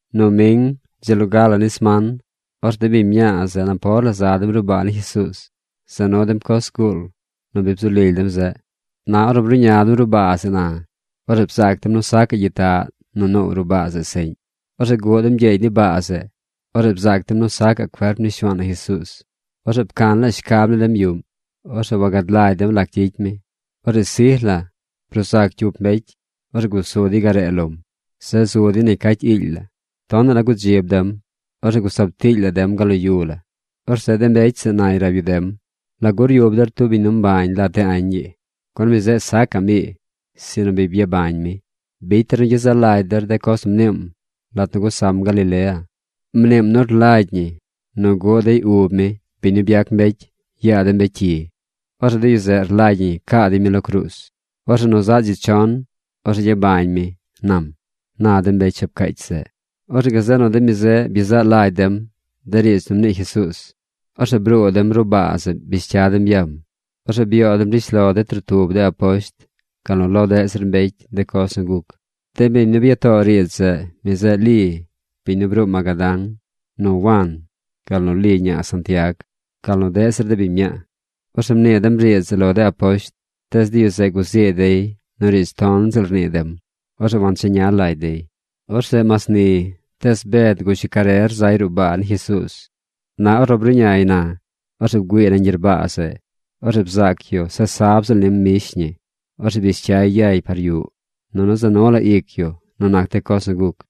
Noming, dzi loga ni sman, orzeꞌ de biñ mñaa zeꞌ napor la za dem ruꞌ baa ni Jesuuz. Za nu dem coz zguul nu bzu lily dem zeꞌ. Na ornu bruꞌña dem ruꞌ baa zeꞌ na, orzeꞌ bzaac dem nu sacaꞌ gyitaꞌ nu noow ruꞌ baa zeꞌ seꞌñ. Orzeꞌ guꞌ dem gyeegy ni baa zeꞌ. Orzeꞌ bzaac dem nu sacaꞌ cuerp ni Shuaan na Jesuuz. Orzeꞌ pcan shcab ni dem yuꞌm. Orzeꞌ wagad lagy dem lac gyicy mi. Orzeꞌ sij la bruu zac cyup mbecy. Orzeꞌ gusu dey garee lom. Zeꞌ zu dey negy cacy iily la. Tonaꞌ la gudzib dem. Orzeꞌ gusab tiily la dem gal lo yu la. Orzeꞌ de mbecy zeꞌ nay rab yu dem: ―¿Lagu ryub der tub biñ mbañ lat de añ ii? Gun mi zeꞌ sacaꞌm ii, sinu bi byabañ mi. Bicy der nu gyezaꞌ lagy der de coz nu mniim lat nu gusam Galilea. Mniim nu rlagy ñi nu guꞌ dey ub mi, biñ nu byac mbecy, yaa de mbecy cyi. Orzeꞌ de yu zeꞌ rlagy ñi caa dey mi lo cruuz. Orzeꞌ nu zaꞌ dzi chon, orzeꞌ gyabañ mi, nam ―na de mbecy shab cacy zeꞌ. Orzeꞌ gazeꞌ nu de mi zeꞌ byezaꞌ lagy dem de riidz nu mnii Jesuuz. Orzeꞌ bruu dem ruꞌ baa zeꞌ bish cya dem yam. Orzeꞌ byoo dem rishlo de trotub de aposht, gal nu lo deꞌ zir mbecy de coz nu guc. De biñ nu bya too riidz zeꞌ, mi zeꞌ Li, biñ nu bruu Magadán, nu Wan, gal nu Li ñaa Santiag, gal nu deꞌ zir de biñ mñaa. Orzeꞌ mnii dem riidz zeꞌ lo de aposht. Tees de yu zeꞌ guzii dey nu riidz ton ziꞌl rnii dem. Orzeꞌ wancheña lagy dey. Orzeꞌ mas ni, tees Bed gush yu carer zay ruꞌ baa ni Jesuuz. Na ornu bruꞌñay na, orzeꞌ bgüiiy nañ gyerbaa zeꞌ. Orzeꞌ bzaac yu se sab ziꞌl nim mbish ñi. Orzeꞌ bish cyay yay par yuꞌ. Nunu za nu la ic yu nu nac de coz nu guc.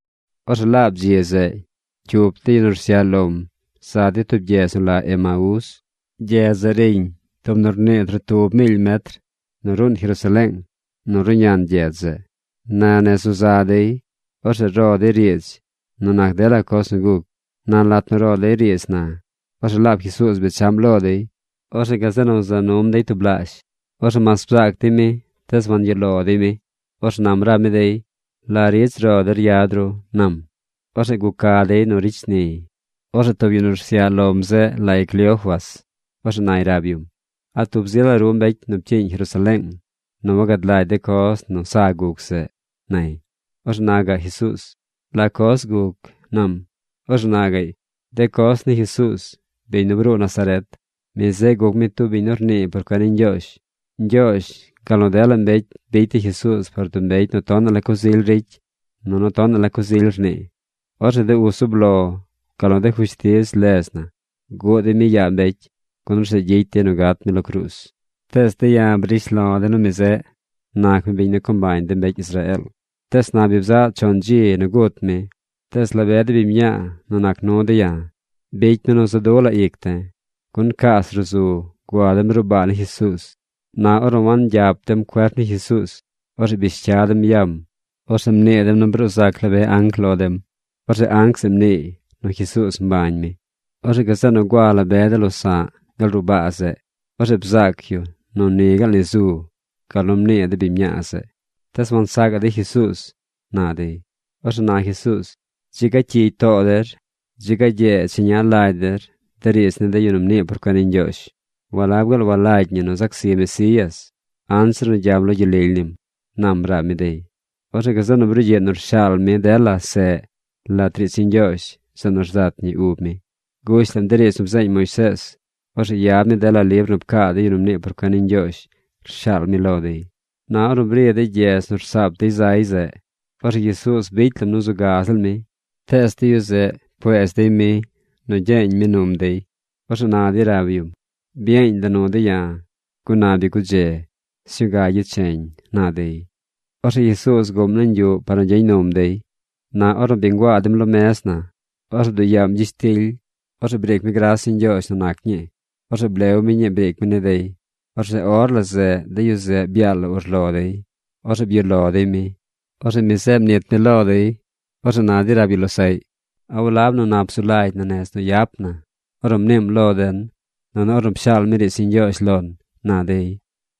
Orzeꞌ laab dzi zeꞌ cyup de yu nu rsyaꞌ lom za dey tub gyedz nu la Emaés. Gyedz zeꞌ riñ tub nu rnii trotub miily metr nu ruun Jerusaleeng ruꞌñan gyedz zeꞌ. Na nez nu za dey, orzeꞌ ro dey riidz nu nac dela coz nu guc. Na lat nu ro dey riidz na, orzeꞌ laab Jesuuz bechaꞌm lo dey. Orzeꞌ gazeꞌ nu za num dey tublaazh. Orzeꞌ mas bzaac dey mi, tees wangyuꞌ lo dey mi. Orzeꞌ nam rab mi dey: ―¿La riidz ro der yad ru? ―nam. Orzeꞌ guca dey nu ricy shniy. Orzeꞌ tub yu nu rsyaꞌ lom zeꞌ lay Cleofas. Orzeꞌ nay rab yum: ―¿A tub zi la ru mbecy nu pcyiiñ Jerusaleeng nu wagad lagy de coz nu sa guc zeꞌ? ―nay. Orzeꞌ na gaꞌ Jesuuz: ―¿La coz guc? ―nam. Orzeꞌ na gaꞌy: ―De coz ni Jesuuz, biñ nu bruu Nazaret. Mi zeꞌ guc mi tub biñ nu rnii por cuen ni Ñgyoozh. Ñgyoozh, gal nu dela mbecy bicy dey Jesuuz par tub mbecy nu tonaꞌ la coz ily ricy nunu tonaꞌ la coz ily rnii. Orzeꞌ de uz zub lo gal nu de fushtiz ledz na bguꞌ dey mi yaa mbecy, gun orzeꞌ gyicy dey nu gat mi lo cruuz. Tees de̱ ya̱ brish lo̱ de̱ nu mi zeꞌ nac mi biñ nu co mbañ de mbecy Israeel. Tees na bi bzaꞌ chon dzi nu gut mi. Tees la be de biñ mñaa nu nac nu de̱ ya̱ bicy mi nu za̱ du̱ la ic de̱. Gun cas ruꞌ zu gua dem ruꞌ baa ni Jesuuz. Na ornu wangyap dem cuerp ni Jesuuz, orzeꞌ bish cya dem yam. Orzeꞌ mnii dem nu bruu zac la be anc lo dem. Orzeꞌ anc zeꞌ mniiy nu Jesuuz mbañ mi. Orzeꞌ gazeꞌ nu gua la be de losa̱ꞌ gal ruꞌ baa zeꞌ. Orzeꞌ bzaac yu nu ni gaal ni zu, gal nu mnii de biñ mñaa zeꞌ. Tees wansacaꞌ dey Jesuuz ―na dey. Orzeꞌ na Jesuuz: ―¡Dzi ga cyigy too der! ¡Dzi ga gyee cheña lagy der de riidz ni de yu nu mnii por cuen ni Ñgyoozh! ¿Walab gaal walagy ñi nu zac zi Mesías anzir nu gyam lo gyel lily nim? ―nam rab mi dey. Orzeꞌ gazeꞌ nu brugyiꞌ nu rshaal mi dela seꞌ lat riidz ni Ñgyoozh zeꞌ nu rzat ñi ub mi. Gush lam de riidz nu bzeeñ Moisees. Orzeꞌ yad mi dela libr nu pcaa de yu nu mnii por cuen ni Ñgyoozh rshaal mi lo dey. Na ornu bri dey gyedz nu rsaap dey zeꞌ, orzeꞌ Jesuuz bicy lam nu zu ga ziꞌl mi. Tees de yu zeꞌ pcueez dey mi nu gyeeñ mi num dey. Orzeꞌ na dey rab yum: ―Byeeñ la nu de̱ ya̱, gun na bi gudze. Sñuu ga gyecheñ ―na dey. Orzeꞌ Jesuuz guꞌm nañ yuꞌ par nu gyeñ num dey. Na ornu bi nguaa dem lo mez na, orzeꞌ bduꞌ yaam gyishtily. Orzeꞌ briic mi gras ni Ñgyoozh nu nac ñii. Orzeꞌ blew mi ñii briic mi ni dey. Orzeꞌ or la zeꞌ de yu zeꞌ byaal la urlo dey. Orzeꞌ byuꞌ lo dey mi. Orzeꞌ mi zeꞌ mnit mi lo dey. Orzeꞌ na dey rab yu losaꞌy: ―¿A walab nu nap zu lagy na nez nu yap na ornu mniim lo den, nunu ornu pshaal mi riidz ni Ñgyoozh lon? ―na dey.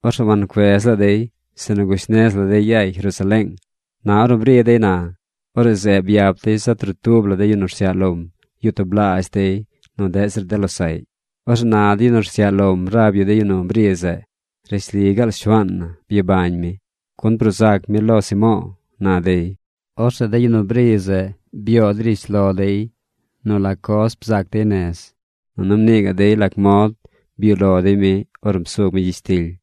Orzeꞌ wancuez la dey, sinu gush nez la dey yay Jerusaleeng. Na ornu bri dey na, orzeꞌ zeꞌ byap dey zaꞌ trotub la de yu nu rsyaꞌ lom yuꞌ tublaazh dey nu deꞌ zir de losaꞌy. Orzeꞌ na de yu nu rsyaꞌ lom rab yu de yu nu bri zeꞌ: ―Rishli ni gaal Shuaan na byabañ mi, gun bruu zac mi lo Simo̱o̱ ―na dey. Orzeꞌ de yu nu bri zeꞌ byoo dey rishlo dey nu la coz bzaac dey nez. Nunu mnii gaꞌ dey lac mod byuꞌ lo dey mi ornu psug mi gyishtily.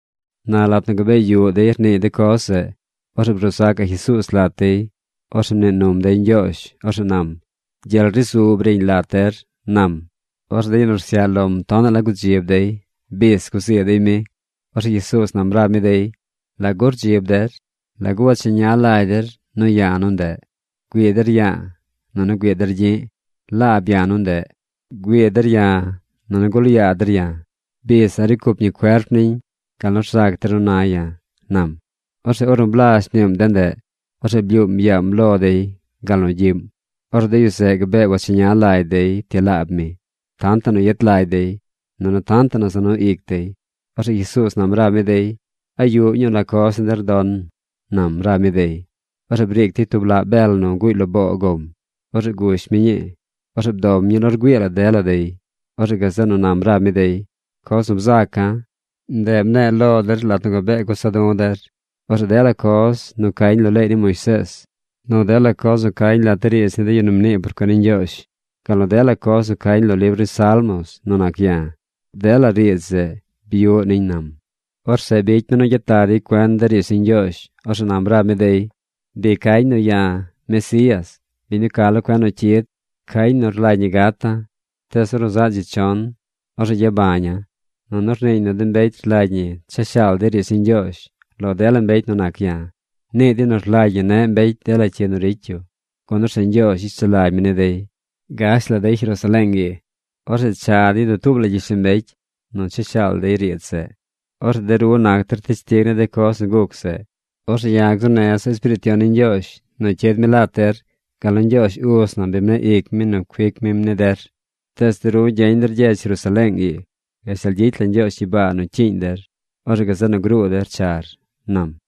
Na lat nu gabee yuꞌ dey rniiy de coz zeꞌ, orzeꞌ bruu zacaꞌ Jesuuz lat dey. Orzeꞌ mnii num dey ñgyoozh. Orzeꞌ nam: ―Gyel ri zu briñ lat der ―nam. Orzeꞌ de yu nu rsyaꞌ lom tonaꞌ la gudzib dey. Bis guzii dey mi. Orzeꞌ Jesuuz nam rab mi dey: ―¿Lagu rdzib der? ¿Lagu wacheña lagy der nu ya̱ nu ndeꞌ? Güii der ya̱a̱ nunu güii der gyi̱ꞌ. Laab ya̱ nu ndeꞌ. Güii der ya̱, nunu gul yaa der ya̱. Bis a̱ꞌ ricy cup ñi cuerp niñ gal nu rzac der nu na ya̱ ―nam. Orzeꞌ ornu blazh mniim de ndeꞌ, orzeꞌ blyuum yaam lo dey gal nu gyiꞌm. Orzeꞌ de yu zeꞌ gabee wacheña lagy dey ti laab mi, tantaꞌ nu yet lagy dey, nunu tantaꞌ nu za nu ic dey. Orzeꞌ Jesuuz nam rab mi dey: ―¿A yuꞌ ñuu la coz ni der don? ―nam rab mi dey. Orzeꞌ briic dey tub laꞌ bel nu guuy lo boo gom. Orzeꞌ gush mi ñii. Orzeꞌ bdom ñii lo rgüii dela dey. Orzeꞌ gazeꞌ nu nam rab mi dey: ―Coz nu bzaca̱, ndeꞌ mne̱e̱ lo der lat nu gabee gusa du̱ der. Orzeꞌ dela coz nu cañ lo leey ni Moisees, nu dela coz nu cañ lat de riidz ni de yu nu mnii por cuen ni Ñgyoozh, gal nu dela coz nu cañ lo libr ni salmos nu nac ya̱, dela riidz zeꞌ byuꞌ niñ ―nam. Orzeꞌ bicy mi nu gyet lag dey cuen de riidz ni Ñgyoozh. Orzeꞌ nam rab mi dey: ―Bi cañ nu ya̱, Mesías, biñ nu ca lo cuen nu cyid. Cañ nu rlagy ñi gata̱. Tees ornu zaꞌ dzi chon, orzeꞌ gyabaña̱ꞌ. Nunu rniiñ nu de mbecy rlagy ñi cha shaal dey riidz ni Ñgyoozh lo dela mbecy nu nac ya̱. Nii dey nu rlagy ñi neꞌ mbecy dela cyi nu ricy yu, gun orzeꞌ Ñgyoozh gyicy sulagy mi ni dey. Gash dey Jerusaleeng. Orzeꞌ cha dey dutuub la gyishlombecy nu cha shaal dey riidz zeꞌ. Orzeꞌ de ru nac der teshtig ni de coz nu guc zeꞌ. Orzeꞌ ya̱ gzuu neza̱ Espiriit Yon ni Ñgyoozh nu cyid mi lat der gal nu Ñgyoozh uz na bi mneꞌ ic mi nu cuic mim ni der. Tees de ru gyeñ der gyedz Jerusaleeng ii gashtal gyicy la Ñgyoozh gyibaa nu cyiiñ der. Orzeꞌ gazeꞌ nu gruu der char ―nam.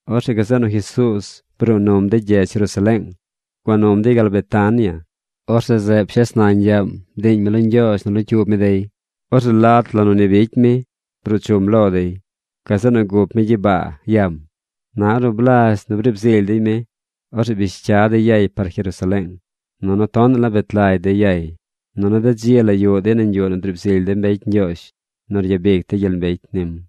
Orzeꞌ gazeꞌ nu Jesuuz bruu num dey gyedz Jerusaleeng. Guam num dey gal Betania. Orzeꞌ zeꞌ pshes nañ yaam bdiiñ mi lo Ñgyoozh nu locyuub mi dey. Orzeꞌ lat nu ni bicy mi bruu chum lo dey. Gazeꞌ nu gup mi gyibaa yam. Na ornu blazh nu briib zily dey mi, orzeꞌ bish cya dey yay par Jerusaleeng. Nunu tonaꞌ la bet lagy dey yay. Nunu de dzi la yuꞌ dey nañ yuꞌ nu driib zily de mbecy Ñgyoozh nu ryabic dey gyel mbecy nim.